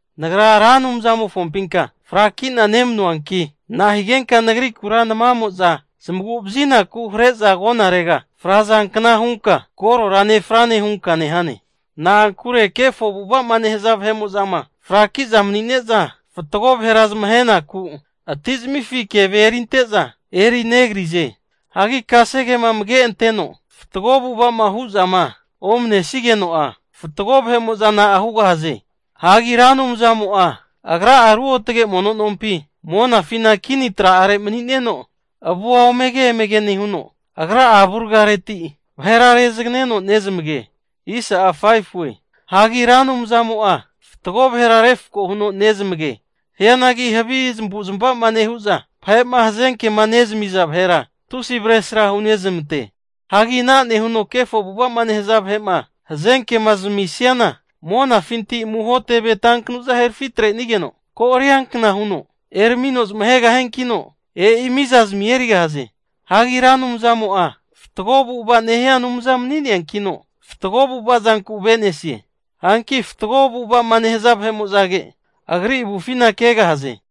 Nagra Ra Anumzamofompinka frakina nemanuanki, nahigenka nagrikura namamo'za zamagu'vazinaku hare'za agonarega frazankna hunka korora nefrane hunka nehane. Na'ankure kefo avu'ava'ma nehaza vahe'mo'zama fraki'za mani'ne'za, fatgo vahera zamahenaku atizamifi keve erinte'za eri negrize. Hagi kasegema amage anteno fatgo avu'ava'ma hu'zama omanesigeno'a, fatgo vahe'mo'za na'a hugahaze. Hagi Ra Anumzamo'a Agra'a ruotage mono nompi monafina kini tra'are mani'neno, avua omege emege nehuno, Agra'a avurgareti vahera rezagneno nezamage. Hagi Ra Anumzamo'a fatgo vahera refko huno nezamage. Hianagi havi zamavu'zmavama nehu'za, vahe'ma hazenkema nezamiza vahera tusi avesra hunezmante. Hagi ana nehuno kefo avu'ava'ma nehaza vahe'ma hazenkema zamisiana monafinti amuho teve tankanuza herafi atrenigeno ko'arianka huno eramino zamahegahiankino, e'i miza zamia erigahaze. Hagi Ra Anumzamo'a fatgo avu'ava nehia Anumza mani'neankino, fatgo avu'ava zanku ave'nesie. Hanki fatgo avu'ava'ma nehaza vahe'mo'zage, Agri avufina kegahaze.